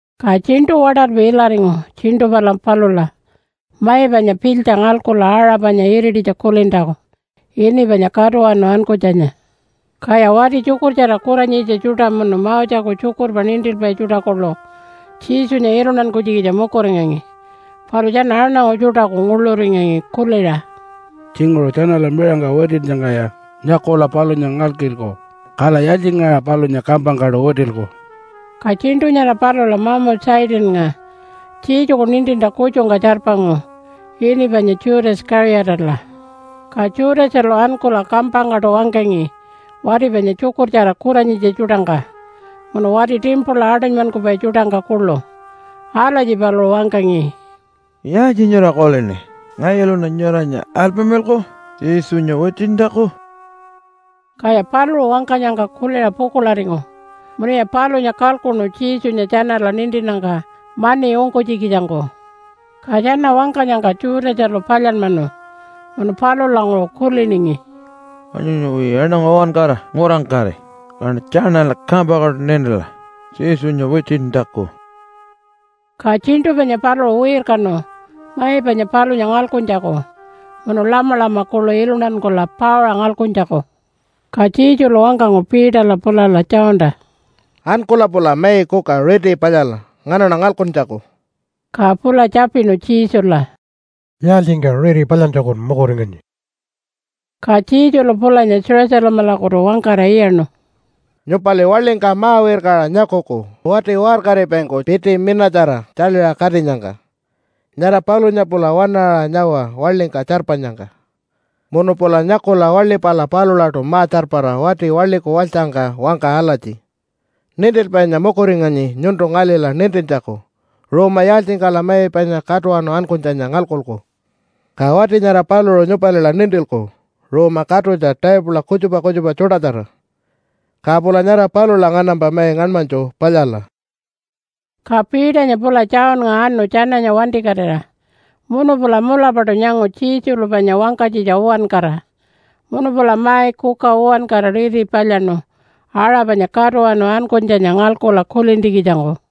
Ka tjiṉṯu waṯalpi ilaringu tjiṉṯu pala palula mai panya pilytja ngalkula aṟa panya irititja kulintjaku ini panya Katuwanu Ankunytjanya. Kaya wati tjukurtjara kuranyitja tjuṯa munu Moseku tjukurpa nintilpai tjuṯa kuḻu Jesunya iluntankunytjikitja mukuringangi, palu tjana aṉangu tjuṯaku nguḻuringangi kuliṟa, “Tjinguṟu tjanala miṟangka witinnyangkaya nyakula palunya ngalkilku. Kala yaaltjingaṟa palunya kampangkaṯu witilku?” Ka tjiṉṯu nyara palula mamu Satannga Jesuku nintintja kutjungka tjarpangu ini panya Judas Kaṟiyatala. Ka Judasalu ankula kampangkaṯu wangkangi wati panya tjukurtjara kuranyitja tjuṯangka munu wati timpula aṯunymankupai tjuṯangka kuḻu. Alatji paluṟu wangkangi, “Yaaltji nyura kulini? Ngayuluṉa nyuranya alpamilalku Jesunya witintjaku?” Kaya paluṟu wangkanyangka kuliṟa pukuḻaringu munuya palunya kalkuṉu Jesunya tjanala nintinnyangka mani ungkunytjikitjangku. Ka tjana wangkanyangka Judasalu palyanmanu munu palulanguṟu kuliningi, “Wanyuyawi aṉangu uwankara ngurangkari, kaṉa tjanala kampangkaṯu nintila Jesunya witintjaku.” Ka tjiṉṯu panya paluṟu wirkanu mai panya palunya ngalkuntjaku munu lamalama kuḻu iluntankula pauṟa ngalkuntjaku. Ka Jesulu wangkangu Peterla pulala Johnta, “Ankula pula mai kuka riti palyala nganaṉa ngalkuntjaku.” Ka pula tjapinu Jesula, “Yaaltjingka riti palyantjakun mukuringanyi?” Ka Jesulu pulanya Jerusalemalakutu wangkara iyaṉu, “Nyupali waḻingka ma-wirkaṟa nyakuku wati waṟkaripaingku piti minatjara tjaḻiṟa katinyangka. Nyara palunya pula waṉaṟa nyawa waḻingka tjarpanyangka. Munu pula nyakula waḻi pala palulaṯu ma-tjarpara wati waḻiku walytjangka wangka alatji, ‘Nintilpainya mukuringanyi nyuntu ngalila nintintjaku ruuma yaaltjingkala mai panya Katuwanu Ankunytjanya ngalkuku.’ Ka wati nyara paluṟu nyupalila nintilku ruuma katutja taipula kutjupa kutjupa tjuṯatjara. Ka pula nyara palula nganampa mai ngaṉmanytju palyala.” Ka Peternya pula Johnnga anu tjananya wantikatira munu pula mulapaṯu nyangu Jesulu panya wangkanytjitja uwankara. Munu pula mai kuka uwankara riti palyaṉu aṟa panya Katuwanu Ankunytjanya ngalkula kulintjikitjangku.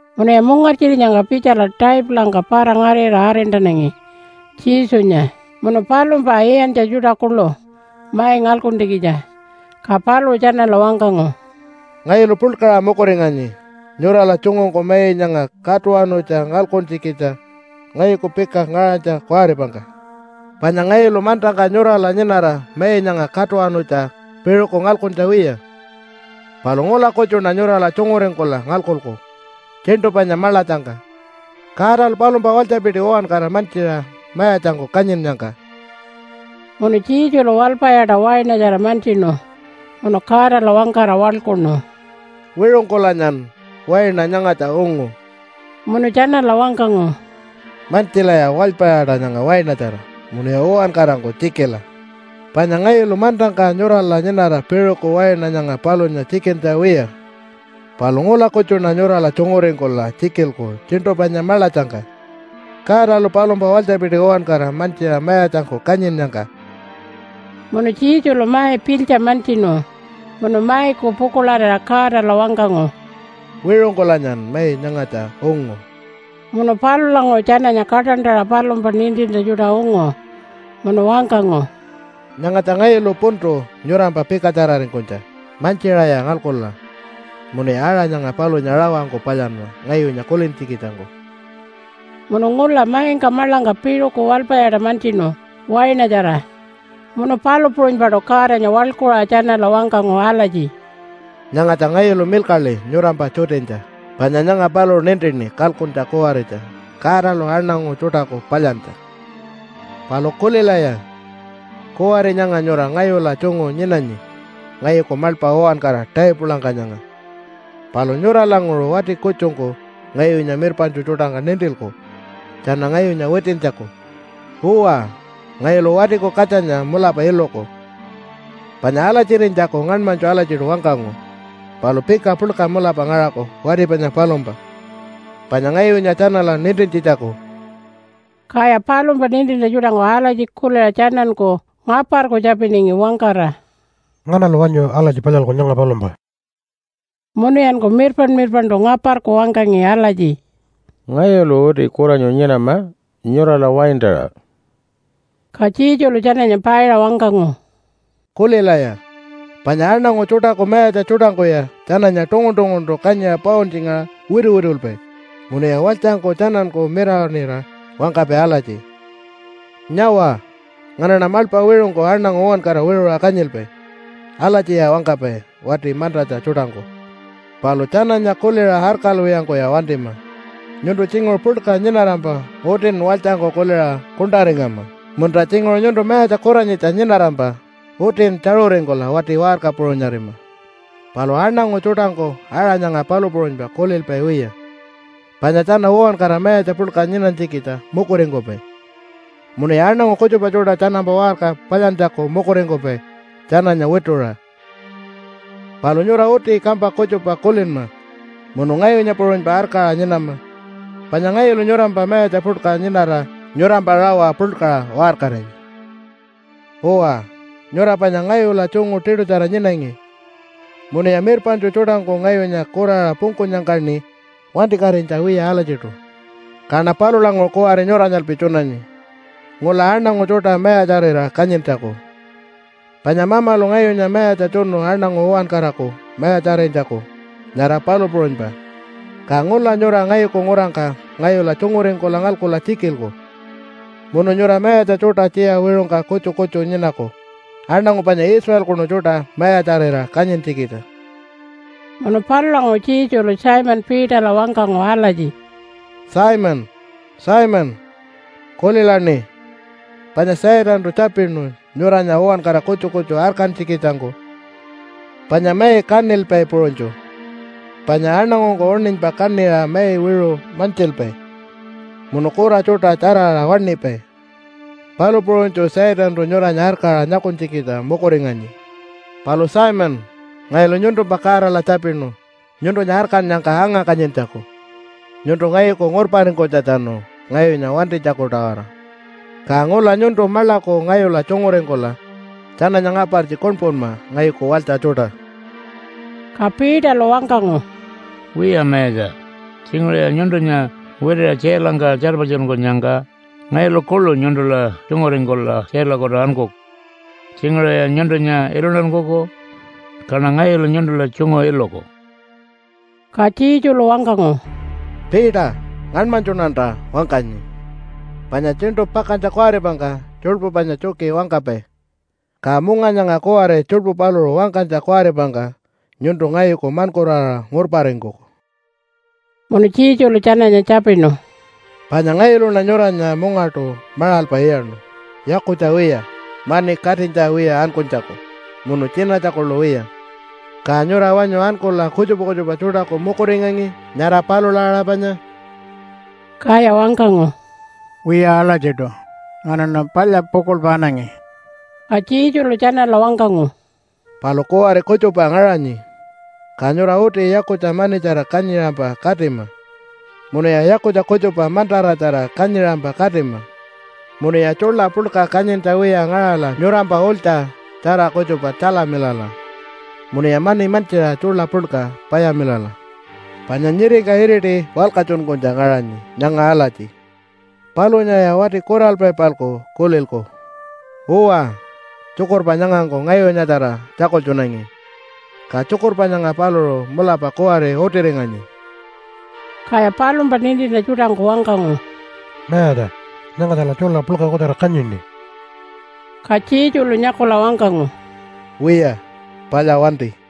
Munuya mungartjirinyangka pitjala taipulangka para-ngarira arintanangi Jesunya munu palumpa iyantja tjuṯa kuḻu mai ngalkuntjikitja. Ka paluṟu tjanala wangkangu, “Ngayulu puḻkaṟa mukuringanyi nyurala tjungungku mai nyanga katuwanutja ngalkuntjikitja ngayuku pika ngaṟanytja kuwaripangka. Panya ngayulu mantangka nyurala nyinara mai nyanga katuwanutja piṟuku ngalkuntja wiya, palu ngula kutjuṉa nyurala tjunguringkula ngalkuku tjiṉṯu panya maḻatjangka Godalu palumpa walytjapiti uwankara mantjiṟa mayatjangku kanyinnyangka.” Munu Jesulu walpayaṯa wainatjara mantjinu munu Godala wangkara waḻkuṉu, “Wiṟungkulanyan waina nyangatja ungu.” Munu tjanala wangkangu, “Mantjilaya walpayaṯa nyanga wainatjara munuya uwankarangku tjikila. Panya ngayulu mantangka nyurala nyinara piṟuku waina nyanga palunya tjikintja wiya, palu ngula kutjuṉa nyurala tjunguringkula tjikilku tjiṉṯu panya maḻatjangka Godalu palumpa walytjapiti uwankara mantjiṟa mayatjangku kanyinnyangka.” Munu Jesulu mai pilytja mantjinu munu maiku pukuḻarira Godala wangkangu, “Wiṟungkulanyan mai nyangatja ungu.” Munu palulanguṟu tjananya kaṯantaṟa palumpa nintintja tjuṯa ungu munu wangkangu, “Nyangatja ngayulu puntu nyurampa pikatjararingkunytja. Mantjiṟaya ngalkula, munuya aṟa nyanga palunya rawangku palyanma ngayunya kulintjikitjangku.” Munu ngula maingka maḻangka piṟuku walpayaṯa mantjinu wainatjara munu palu puṟunypaṯu Godanya waḻkuṟa tjanala wangkangu alatji, “Nyangatja ngayulu milkaḻi nyurampa tjutinytja, panya nyanga paluṟu nintini kalkuntja kuwaritja Godalu aṉangu tjuṯaku palyantja. “Palu kulilaya! Kuwari nyanga nyura ngayula tjungu nyinanyi ngayuku maḻpa uwankara taipulangka nyanga. Palu nyuralanguṟu wati kutjungku ngayunya mirpaṉtju tjuṯangka nintilku tjana ngayunya witintjaku. Uwa, ngayulu Watiku Katjanya mulapa iluku panya alatjirinytjaku ngaṉmanytju alatjiṯu wangkangu. Palu pika puḻka mulapa ngaṟaku wati panya palumpa, panya ngayunya tjanala nintintjitjaku.” Kaya palumpa nintintja tjuṯangku alatji kuliṟa tjananku ngaparku tjapiningi wangkara, “Nganalu wanyu alatji palyalku nyanga palumpa?” Munuyanku mirpaṉ-mirpaṉṯu ngaparku wangkangi alatji, “Ngayulu uti kuranyu nyinama nyurala waintaṟa.” Ka Jesulu tjananya paiṟa wangkangu, “Kulilaya! Panya aṉangu tjuṯaku mayatja tjuṯangkuya tjananya tungun-tunguntu kanyiṟa pauntjingaṟa wituwitulpai, munuya walytjangku tjananku mirawaṉira wangkapai alatji, ‘Nyawa, nganaṉa maḻpa wiṟungku aṉangu uwankara wiṟuṟa kanyilpai.’ Alatjiya wangkapai wati mantatja tjuṯangku. Palu tjananya kuliṟa arkalwiyangkuya wantima. Nyuntu tjinguṟu puḻka nyinarampa utin walytjangku kuliṟa kuṉṯaringama, munta tjinguṟu nyuntu mayatja kuranyitja nyinarampa utin tjaṟuringkula wati waṟka puṟunyarima. Palu aṉangu tjuṯangku aṟa nyanga palu puṟunypa kulilpai wiya, panya tjana uwankara mayatja puḻka nyinanytjikitja mukuringkupai, munuya aṉangu kutjupa tjuṯa tjanampa waṟka palyantjaku mukuringkupai tjananya wituṟa. Palu nyura uti kampa kutjupa kulinma munu ngayunya puṟunypa arkaṟa nyinama, panya ngayulu nyurampa mayatja puḻka nyinara nyurampa rawa puḻkaṟa waṟkaringi. “Uwa, nyura panya ngayula tjungu tiṯutjara nyinangi munuya mirpaṉtju tjuṯangku ngayunya kuraṟa pungkunyangkaṉi wantikatinytja wiya alatjiṯu. Kaṉa palulanguṟu kuwari nyuranyalpi tjunanyi ngula aṉangu tjuṯa mayatjarira kanyintjaku, panya Mamalu ngayunya mayatja tjunu aṉangu uwankaraku mayatjarinytjaku, nyara palu puṟunypa. Ka ngula nyura ngayuku ngurangka ngayula tjunguringkula ngalkula tjikilku. Munu nyura mayatja tjuṯa tjiya wiṟungka kutju kutju nyinaku aṉangu panya Israelkunu tjuṯa mayatjarira kanyintjikitja.” Munu palulanguṟu Jesulu Simon Peterla wangkangu alatji, “Simon, Simon, kulilaṉi! Panya Satantu tjapinu nyuranya uwankara kutju kutju arkantjikitjangku panya mai kaṉilpai puṟunytju, panya aṉangungku uṉinypa kaṉiṟa mai wiṟu mantjilpai munu kura tjuṯa tjaraṟa waṉipai, palu puṟunytju Satantu nyuranya arkaṟa nyakunytjikitja mukuringanyi. Palu Simon, ngayulu nyuntumpa Godala tjapinu nyuntunya arkannyangka anga-kanyintjaku nyuntu ngayuku ngurparingkunytjatjanu ngayunya wantinytjaku-tawara. Ka ngula nyuntu maḻaku ngayula tjunguringkula tjananya ngapartji kuṉpunma ngayuku walytja tjuṯa.” Ka Peterlu wangkangu, “Wiya, Mayatja, tjinguṟuya nyuntunya witiṟa tjailangka tjarpatjunkunyangka ngayulu kuḻu nyuntula tjunguringkula tjailakutu ankuku. Tjinguṟuya nyuntunya iluntankuku, kaṉa ngayulu nyuntula tjungu iluku.” Ka Jesulu wangkangu, “Peter, ngaṉmanytjuṉanta wangkanyi, panya tjiṉṯu pakantja kuwaripangka tjuḻpu panya tjuki wangkapai, ka munga nyanga kuwari tjuḻpu paluṟu wangkanytja kuwaripangka nyuntu ngayuku maṉkuraṟa ngurparingkuku.” Munu Jesulu tjananya tjapinu, “Panya ngayuluṉa nyuranya mungaṯu maṟalpa iyaṉu yakutja wiya, mani katinytja wiya ankunytjaku munu tjinatja kuḻu wiya, ka nyura wanyu ankula kutjupa kutjupa tjuṯaku mukuringangi nyara palula aṟa panya?” Kaya wangkangu, “Wiya alatjiṯu. Nganaṉa palya pukuḻpa anangi.” Ka Jesulu tjanala wangkangu, “Palu kuwari kutjupa ngaṟanyi, ka nyura uti yakutja manitjara kanyiṟampa katima, munuya yakutja kutjupa mantaratjara kanyiṟampa katima, munuya tjuḻa puḻka kanyintja wiya ngaṟala nyurampa ulytja tjara kutjupa tjalamilala munuya mani mantjiṟa tjuḻa puḻka payamilala. Panya nyiringka iriti walkatjunkunytja ngaṟanyi nyanga alatji, ‘Palunyaya wati kuralpai-palku kulilku.’ Uwa, tjukurpa nyangangku ngayunyatjara tjakultjunangi, ka tjukurpa nyanga paluṟu mulapa kuwari utiringanyi.” Kaya palumpa nintintja tjuṯangku wangkangu, “Mayatja, nyangatjala tjuḻa puḻka kutjara kanyini.” Ka Jesulu nyakula wangkangu, “Wiya, palya wanti!”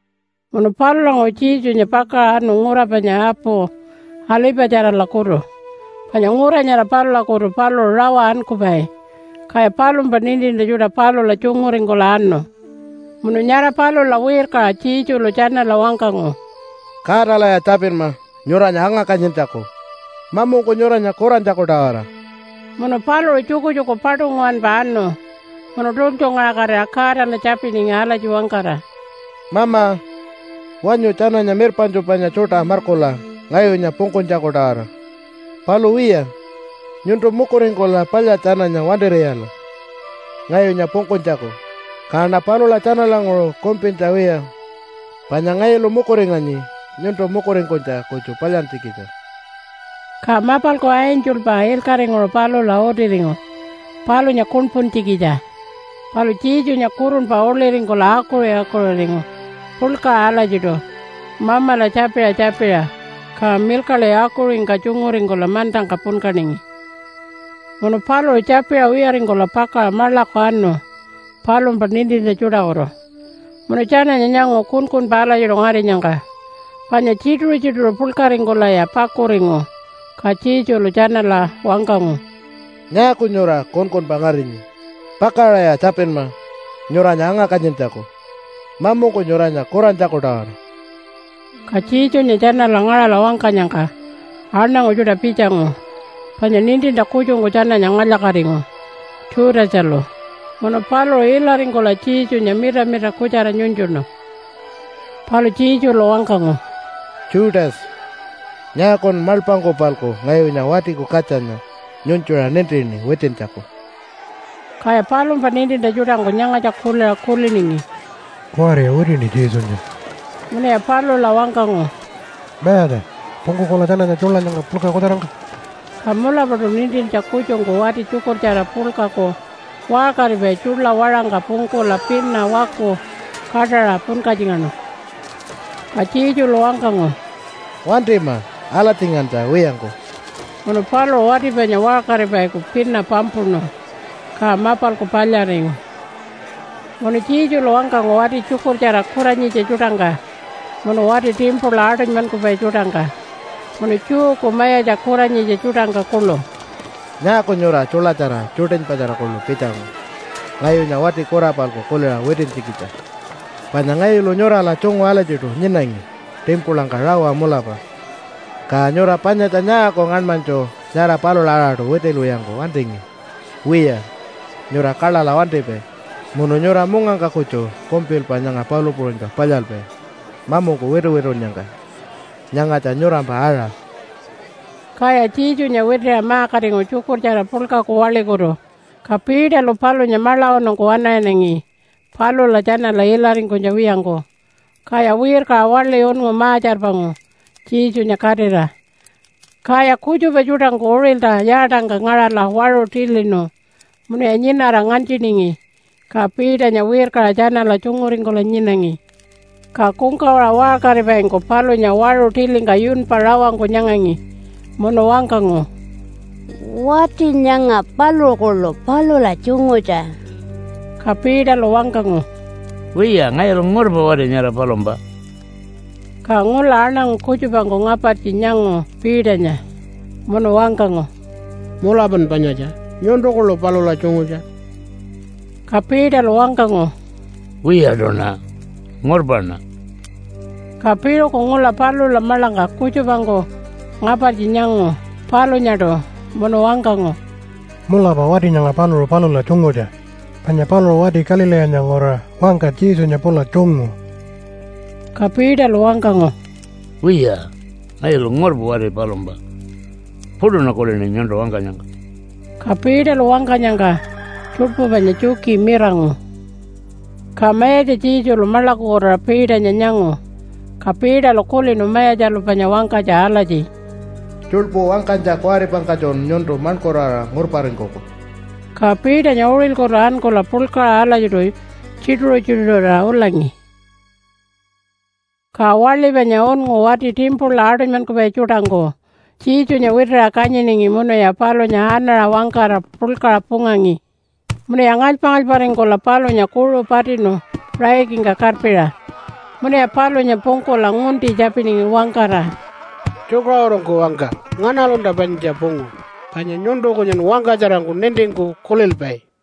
Munu palulanguṟu Jesunya pakaṟa anu ngura panya apu Alipatjaralakutu panya ngura nyara palulakutu paluṟu rawa ankupai, kaya palumpa nintintja tjuṯa palula tjunguringkula anu. Munu nyara palula wirkaṟa Jesulu tjanala wangkangu, “Godalaya tjapinma nyuranya anga-kanyintjaku mamungku nyuranya kurantjaku-tawara.” Munu paluṟu tjukutjuku paṯu nguwanpa anu munu tultjungaṟakatira Godala tjapiningi alatji wangkara, “Mama, wanyu tjananya mirpaṉtju panya tjuṯa markula ngayunya pungkunytjaku-tawara. Palu wiya, nyuntu mukuringkula palya tjananya wantir'iyala ngayunya pungkunytjaku, kaṉa palula tjanalanguṟu kumpintja wiya, panya ngayulu mukuringanyi nyuntu mukuringkunytja kutju palyantjikitja.” (Ka mapalku angelpa ilkaṟinguṟu palula utiringu palunya kuṉpuntjikitja. Palu Jesunya kurunpa uḻiringkula akuṟi-akuṟiringu puḻkaṟa alatjiṯu Mamala tjapiṟa tjapiṟa, ka milkaḻi akuṟingka tjunguringkula mantangka punkaningi.) Munu paluṟu tjapiṟa wiyaringkula pakaṟa maḻaku anu palumpa nintintja tjuṯakutu. Munu tjananya nyangu kunkunpa alatjiṯu ngarinyangka panya tjituṟu-tjituṟu puḻkaringkulaya pakuringu. Ka Jesulu tjanala wangkangu, “Nyaaku nyura kunkunpa ngarinyi? Pakaṟaya tjapinma nyuranya anga-kanyintjaku mamungku nyuranya kurantjaku-tawara.” Ka Jesunya tjanala ngaṟala wangkanyangka aṉangu tjuṯa pitjangu, panya nintintja kutjungku tjananya ngalya-katingu, Judasalu. Munu paluṟu ilaringkula Jesunya mitamita kutjara nyunytjuṉu. Palu Jesulu wangkangu, “Judas, nyaakun maḻpangku-palku ngayunya Watiku Katjanya nyunytjuṟa nintini witintjaku?” Kaya palumpa nintintja tjuṯangku nyangatja kuliṟa kuliningi, “Kuwariya witini Jesunya.” Munuya palula wangkangu, “Mayatja, pungkukula tjananya tjuḻa nyanga puḻka kutjarangka?” Ka mulapaṯu nintintja kutjungku wati tjukurtjara puḻkaku waṟkaripai tjuḻa waṟangka pungkula pina waku kaṯaṟa punkatjingaṉu. Ka Jesulu wangkangu, “Wantima alatjingantja wiyangku!” Munu paluṟu wati panya waṟkaripaiku pina pampuṉu, ka mapalku palyaringu. Munu Jesulu wangkangu wati tjukurtjara kuranyitja tjuṯangka munu wati timpula aṯunymankupai tjuṯangka munu Jewku mayatja kuranyitja tjuṯangka kuḻu, “Nyaaku nyura tjuḻatjara tjuṯinypatjara kuḻu pitjangu ngayunya wati kura-palku kuliṟa witintjikitja? Panya ngayulu nyurala tjungu alatjiṯu nyinangi timpulangka rawa mulapa, ka nyura panyatja nyaaku ngaṉmanytju nyara palula aṟaṯu witilwiyangku wantingi? Wiya, nyura kaḻaḻa wantipai munu nyura mungangka kutju kumpilpa nyanga palu puṟunypa palyalpai mamungku wituwitunnyangka. Nyangatja nyurampa aṟa.” Kaya Jesunya witiṟa ma-katingu tjukurtjara puḻkaku waḻikutu. Ka Peterlu palunya maḻawanungku waṉaṟinangi palula tjanala ilaringkunytja wiyangku. Kaya wirkaṟa waḻi unngu ma-tjarpangu Jesunya katira. Kaya kutjupa tjuṯangku uṟilta yaatangka ngaṟala waṟu tilinu munuya nyinara nganytjiningi. Ka Peternya wirkaṟa tjanala tjunguringkula nyinangi. Ka kungkawaṟa waṟkaripaingku palunya waṟu tilingka yunpa rawangku nyangangi munu wangkangu, “Wati nyanga paluṟu kuḻu palula tjungutja.” Ka Peterlu wangkangu, “Wiya, ngayulu ngurpa wati nyara palumpa!” Ka ngula aṉangu kutjupangku ngapartji nyangu Peternya munu wangkangu, “Mulapan panyatja, nyuntu kuḻu palula tjungutja.” Ka Peterlu wangkangu, “Wiyaṯuṉa! Ngurpaṉa!” Ka piṟuku ngula palula maḻangka kutjupangku ngapartji nyangu palunyaṯu munu wangkangu, “Mulapa wati nyanga paluṟu palula tjungutja, panya paluṟu wati Galileenya nguraṟa wangka Jesunya pula tjungu.” Ka Peterlu wangkangu, “Wiya, ngayulu ngurpa wati palumpa! Puṯuṉa kulini nyuntu wangkanyangka.” Ka Peterlu wangkanyangka tjuḻpu panya tjuki mirangu. Ka Mayatja Jesulu maḻakukutuṟa Peternya nyangu. Ka Peterlu kulinu Mayatjalu panya wangkanytja alatji, “Tjuḻpu wangkanytja kuwaripangkatjun nyuntu maṉkuraṟa ngurparingkuku.” Ka Peternya uṟilkutu ankula puḻkaṟa alatjiṯu tjituṟu-tjituṟurira ulangi. Ka waḻi panya unngu wati timpula aṯunymankupai tjuṯangku Jesunya witiṟa kanyiningi munuya palunya anaṟa wangkara puḻkaṟa pungangi, munuya ngalypa-ngalyparingkula palunya kuṟu patinu raikingka karpiṟa munuya palunya pungkula ngunti tjapiningi wangkara, “Tjukaṟurungku wangka, nganalunta panyatja pungu? Panya nyuntu kunyun wangkatjarangku nintingku kulilpai.”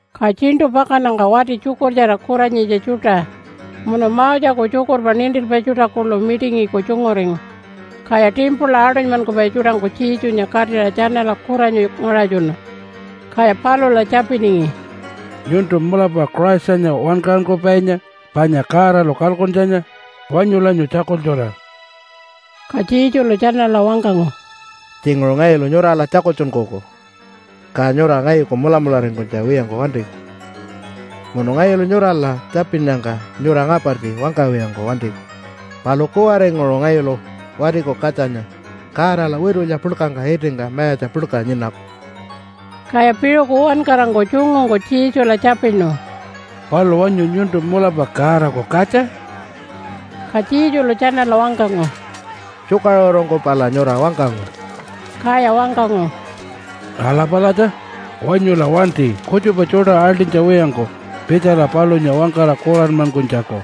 Ka tjiṉṯu pakannyangka wati tjukurtjara kuranyitja tjuṯa munu Moseku tjukurpa nintilpai tjuṯa kuḻu mitingiku tjunguringu, kaya timpula aṯunymankupai tjuṯangku Jesunya katira tjanala kuranyu ngaṟatjunu. Kaya palula tjapiningi, “Nyuntu mulapa Christanya Wankaṟunkupainya panya Godalu kalkuntjanya? Wanyulanya tjakultjura.” Ka Jesulu tjanala wangkangu, “Tjinguṟu ngayulu nyurala tjakultjunkuku ka nyura ngayuku mulamularingkunytja wiyangku wantiku. Munu ngayulu nyurala tjapinnyangka nyura ngapartji wangkawiyangku wantiku. Palu kuwaringuṟu ngayulu Watiku Katjanya Godala witulya puḻkangka itingka mayatja puḻka nyinaku.” Kaya piṟuku uwankarangku tjungungku Jesula tjapinu, “Palu wanyu nyuntu mulapa Godaku katja?” Ka Jesulu tjanala wangkangu, “Tjukaṟurungku pala nyura wangkangu.” Kaya wangkangu, “Ala palatja! Wanyula wanti kutjupa tjuṯa aḻṯinytja wiyangku pitjala palunya wangkara kuranmankunytjaku.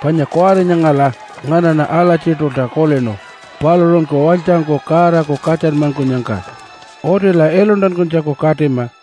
Panya kuwari nyangala nganaṉa alatjiṯulta kulinu paluṟunku walytjangku Godaku katjanmankunyangka. Utila iluntankunytjaku katima.”